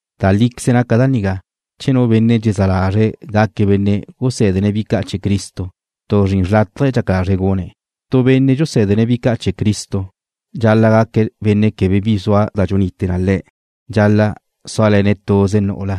Da líqueze naca da nigá: Che nu benne' dxezá lazre̱' gaque̱' benne' gusé̱dene̱' bi ca' chee̱ Cristo, tu zrin xrlátaje dxaca lazre̱' gune̱'. Tu benne' dxusé̱dene̱' bi ca' chee̱ Cristo: Dxal-la' gaque̱' benne' quebe bi zua da dxunite na le̱'. Dxal-la' súale̱ne̱' tuze nu'ula.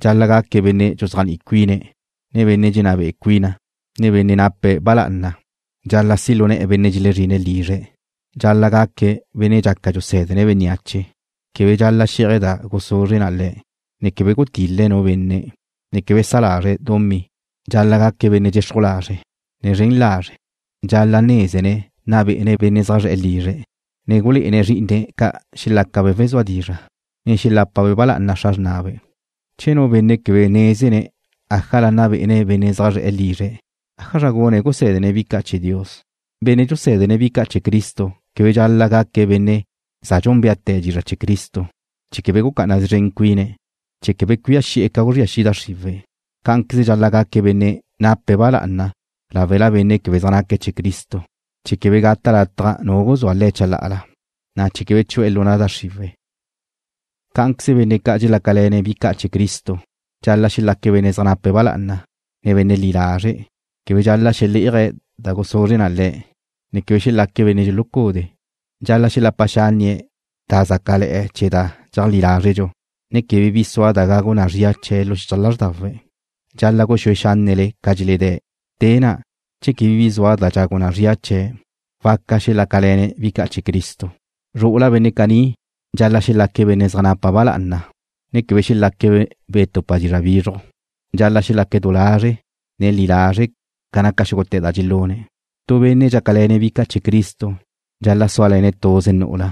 Dxal-la' gaque̱' benne' dxuzéajni'i cuine̱', ne benne' dxenná be'e cuine̱', ne benne' nape̱' ba lá'ana. Dxal-la' si' lu ne̱'e̱ benne' xelezrine̱' lizre̱'. Dxal-la' gaque̱' benne' dxaca dxusé̱dene̱' bénneache. Quebe dxal-la' xé'aje̱' da guzuzre na le̱', ne quebe gutil-le̱' nu benne', ne quebe sa lazre̱' dumí. Dxal-la' gaque̱' benne' dxexruj lazre', ne zren lazre'. Dxal-la' nézene̱' nna be'ene̱' benne' zaj zre̱'e̱ lizre̱', ne gulé'ene̱' zrí'ine̱' ca' xelácabe' wezúa dizra', ne xelápabe' ba lá'ana xra xrnabe'. Che nu benne' quebe nézene̱' ájala nna be'ene̱' benne' zaj zre̱'e̱ lizre̱', ¿ájazra gune̱' gusé̱dene̱' bi ca' chee̱ Dios? Benne' dxusé̱dene̱' bi ca' chee̱ Cristo quebe dxal-la' gaque̱' benne' za dxúnbeate̱ dizra' chee̱ Cristo, chee̱ quebe gucá'ana szren cuine̱', chee̱ quebe cuía xi'e̱ ca guzría xi' da xriwe̱'. Cá'anqueze dxal-la' gaque̱' benne' nape̱' ba lá'ana láwela benne' quebe zaj naque̱' chee̱ Cristo, chee̱ quebe gata' lataj nu guzúa le̱' chalá'ala, na' chee̱ quebe chu'e̱ lu na' da xriwe̱'. Cá'anqueze benne' ca' dxelácale̱ne̱' bi ca' chee̱ Cristo: Dxal-la' xelaque̱' benne' zaj nape̱' ba lá'ana, ne benne' li lazre'. Quebe dxal-la' xelé'aje̱' da guzuzre na le̱', ne quebe xelaque̱' benne' dxulucudee̱'. Dxal-la' xelapa xánnie̱' da zácale̱'e̱ chee̱ da dxeajlí lázredxu, ne quebe bi sua da gagu na zría chee̱' lu xichaj lázrdawe̱'. Dxal-la' guxúe xánnele ca dxeledé̱'. Te na', che quebe bi zua da dxagu na zria chee̱', waca xelácale̱ne̱' bi ca' chee̱ Cristo. Zru'ula benne' caní: Dxal-la' xelaque̱' benne' zaj nape̱' ba lá'ana, ne quebe xelaque̱' wetupa dizra' bizruj. Dxal-la' xelaque̱' du lazre', ne li lazre' ca naca xúgute̱ da dxelune̱'. Tu benne' dxácale̱ne̱' bi ca' chee̱ Cristo dxal-la' súale̱ne̱' tuze nu'ula,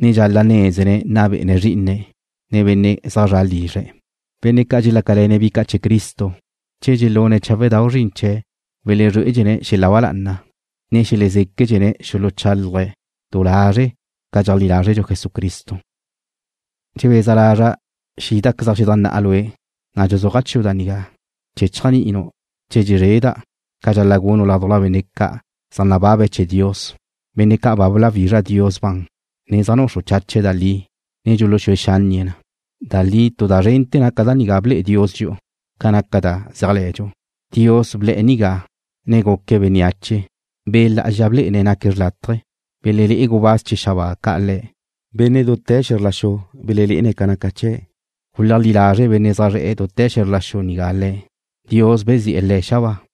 ne dxal-la' nézene̱' nna be'ene̱' zrí'ine̱' ca', ne benne' zaj zre̱'e̱ lizre̱'. Benne' ca' dxelácale̱ne̱' bi ca' chee̱ Cristo, che dxelune̱' cháwedau' zrin chee̱', welezrué'ene̱' xel-la ba lá'ana, na' xelezéquedxene̱' xuluchálaje̱' du lazre̱' ca dxeajlí lázredxu Jesucristo. Dxebeza lazra' xídazequeza' xedajnná'a lue', na' dxuzúaja' chiu' da nigá chee̱ chéajni'inu' che dxezreda', ca dxal-la' gunu' ládujla benne' ca' zaj nababe̱' chee̱ Dios, benne' ca' ba bláwizra Dios ban, ne zaj nuxru chache̱' da li, ne dxuluxúe xánnie̱' na. Da li tu da zrente̱ naca da nigá ble'e Dios dxi'u ca naca da zéajle̱dxu: Dios ble̱'e̱ nigá, ne guque̱' bénneache. Be' Lá'azxa blé'ene̱' naque̱' xlátaje̱. Belelé'e gubáz chee̱ xabáa ca' Le̱'. Benne' dute̱ xe̱zr la xu belenne̱' ca naca chee̱'. Guleajlí lazre' benne' zaj zre̱'e̱ dute̱ xe̱zr la xu nigá Le̱'. Dios bezi'e̱ Le̱' xabáa.